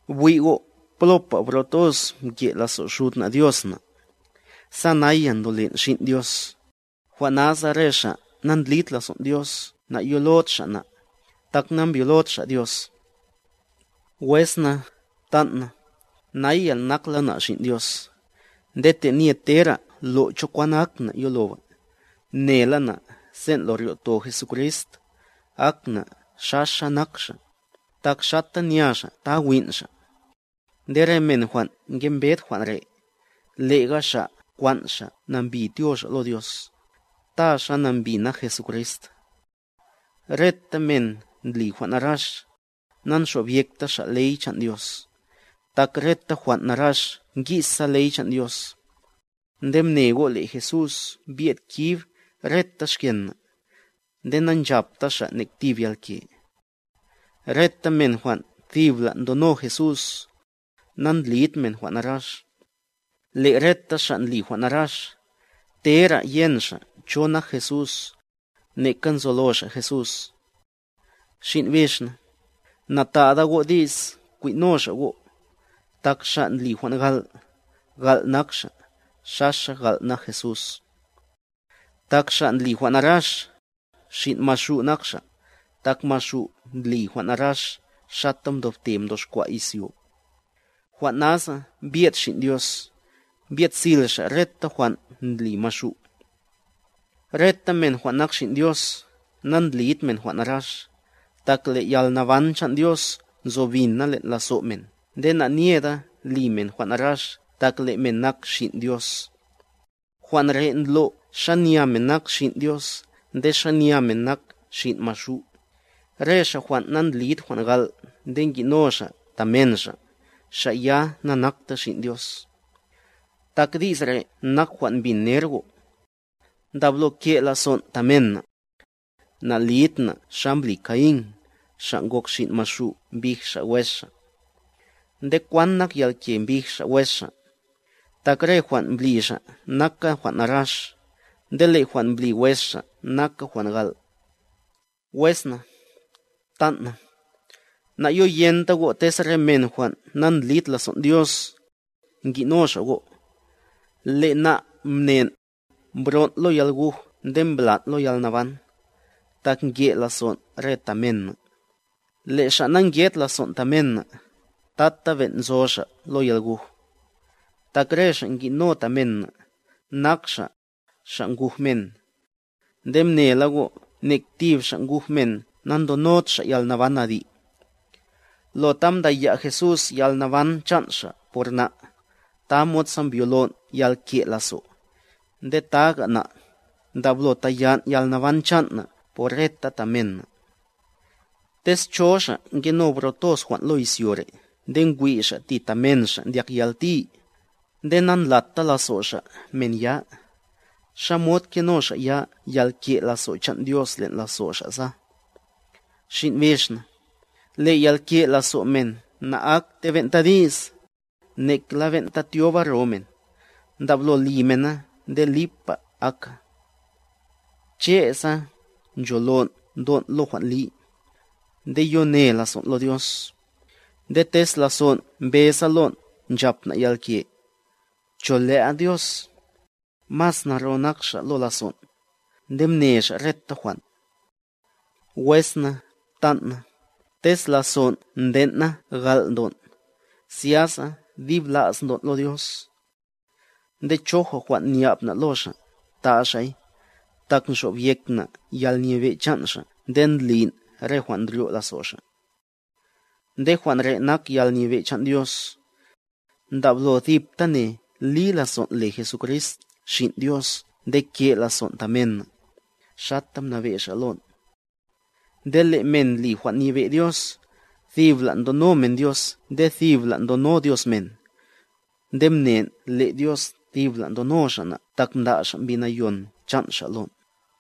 Bwi' go' plopa bro toz mke' lazo' Xud na' Dios na', sa naya ndolen' xin' Dios; jwan' nasa re xa' na'ndlid lazon' Dios nayolod xa' na', tak nambyolod xa' Dios. Wes na, ptan' na, naya nakla na' xin' Dios, nde tenye tera lo' cho kwan ak na' yoloba, mnela na' sen' lo ryo'to Jesucrist, ak na' xaxa nak Xa', tak xata nya Xa' ta win' Xa'. Nde re men jwan' ngembed jwan' re', lega xa' nkwan' xa' nambi tyo xa' lo Dios, ta xa nambi nak Jesucrist. Reta men ndli jwan' narax, nanxobyekta xa' ley chan' Dios, tak reta jwan' narax ngi'sa ley chan' Dios. Nde mne go', le' Jesús mbyed kib reta xken na', nde na'nchapta Xa' nek tib yalke. Reta men jwan' thibla' ndono Jesús, nandlid men jwan' narax, le' reta xa' ndli jwan' narax, tera yen xa' cho nak Jesús, neka nzolo xa' Jesús. Xin' bix na, na'ta'da go' di's kwin'no xa' go', tak xa' ndli jwan' gal', gal' nak xa', xaxa gal' nak Jesús. Tak xa' ndli jwan' narax, xin' maxu' nak xa', tak maxu' ndli jwan' narax xata mdobte mdoxkwa' izyo. Jwan' nasa mbyed Xin' Dios, mbyed sil Xa' reta jwan' ndli maxu'. Reta men jwan' nak xin' Dios, nandlid men jwan' narax, tak le' yalnaban chan' Dios nzo bina len' lazo' men nde na'nyeda li men jwan' narax tak le' men nak xin' Dios. Jwan' re' ndlo' xanya men nak xin' Dios nde xanya men nak xin' maxu', re xa' jwan' nandlid jwan' gal' nde ngi'no xa' ta men xa', xa' ya na'nakta xin' Dios. Tak di's re' nak jwan' mbin ner go': Ndablo ke' lazon' ta men na'. Na'lid na' xa mbli Caín, xa' ngok xin' maxu' mbij xa' wes xa'. ¿Nde kwan nak yalke mbij xa' wes xa'? Tak re jwan' mbli xa' naka jwan' narax, nde le' jwan' mbli wes xa' naka jwan' gal'. Wes na, ptan' na, na'yoyenta go' tez re men jwan' nandlid lazon' Dios, ngi'no xa' go'. Le' na' mnen', mbron' lo yalguj nde mblan' lo yalnaban, tak nke' lazon' re ta men na', le' xa' na'nke'd lazon' ta men na', tata ben' nzo xa' lo yalguj. Tak re xa' ngi'no ta men na', nak xa', xa' guj men. Nde mnela go' nek tib xa' guj men na'ndonod xa' yalnaban adi'. Lo ta mdaya' Jesús yalnaban chan' Xa' por na', tamod sa mbyolon' yalke' lazo', nde taga na', ndablo tayan' yalnaban chan' na' por re ta men na'. Tez cho xa' nkeno bro jwan' lo izyo re' nde ngwi' xa' ti ta men xa' ndyak yalti, nde na'ndlata lazo' xa' men ya, ¿xamod keno xa' ya yalke' lazo' chan' Dios len' lazo' xa' sa? Xin' bix na, le' yalke' lazo' men na'akte ben'ta di's, nekla ben'ta tyoba ro men, ndablo li mena nde lipa aka. Che', sa ncholon' ndon' lo jwan' li,a nde yo ne lazon' lo Dios, nde tez lazon' mbeza lon' nchap na' yalke, cho le'a Dios, mas naro nak Xa' lo lazon', nde mne Xa' reta jwan'. Wes na, ptan' na, tez lazon' nden' na gal' ndon', zyasa dib la's ndon' lo Dios. Nde choja jwan' nya'b na' lo Xa', ta' Xa'y, tak nxobyek na' yalnyebe' chan' Xa' nde ndlin' re jwan' ndryo' lazo' Xa'. Nde jwan' re' nak yalnyebe' chan' Dios: Ndablo thiptane li lazon' le Jesucrist Xin' Dios nde ke' lazon' ta men na', xata mnabe' Xa' lon'. Nde le' men ndli jwan' nyebe' Dios, tibla' ndono men Dios nde tibla' ndono Dios men. Nde mnen' le' Dios tibla' ndono Xa' na' tak mda' Xa' Mbi Nayon chan' Xa' lon'.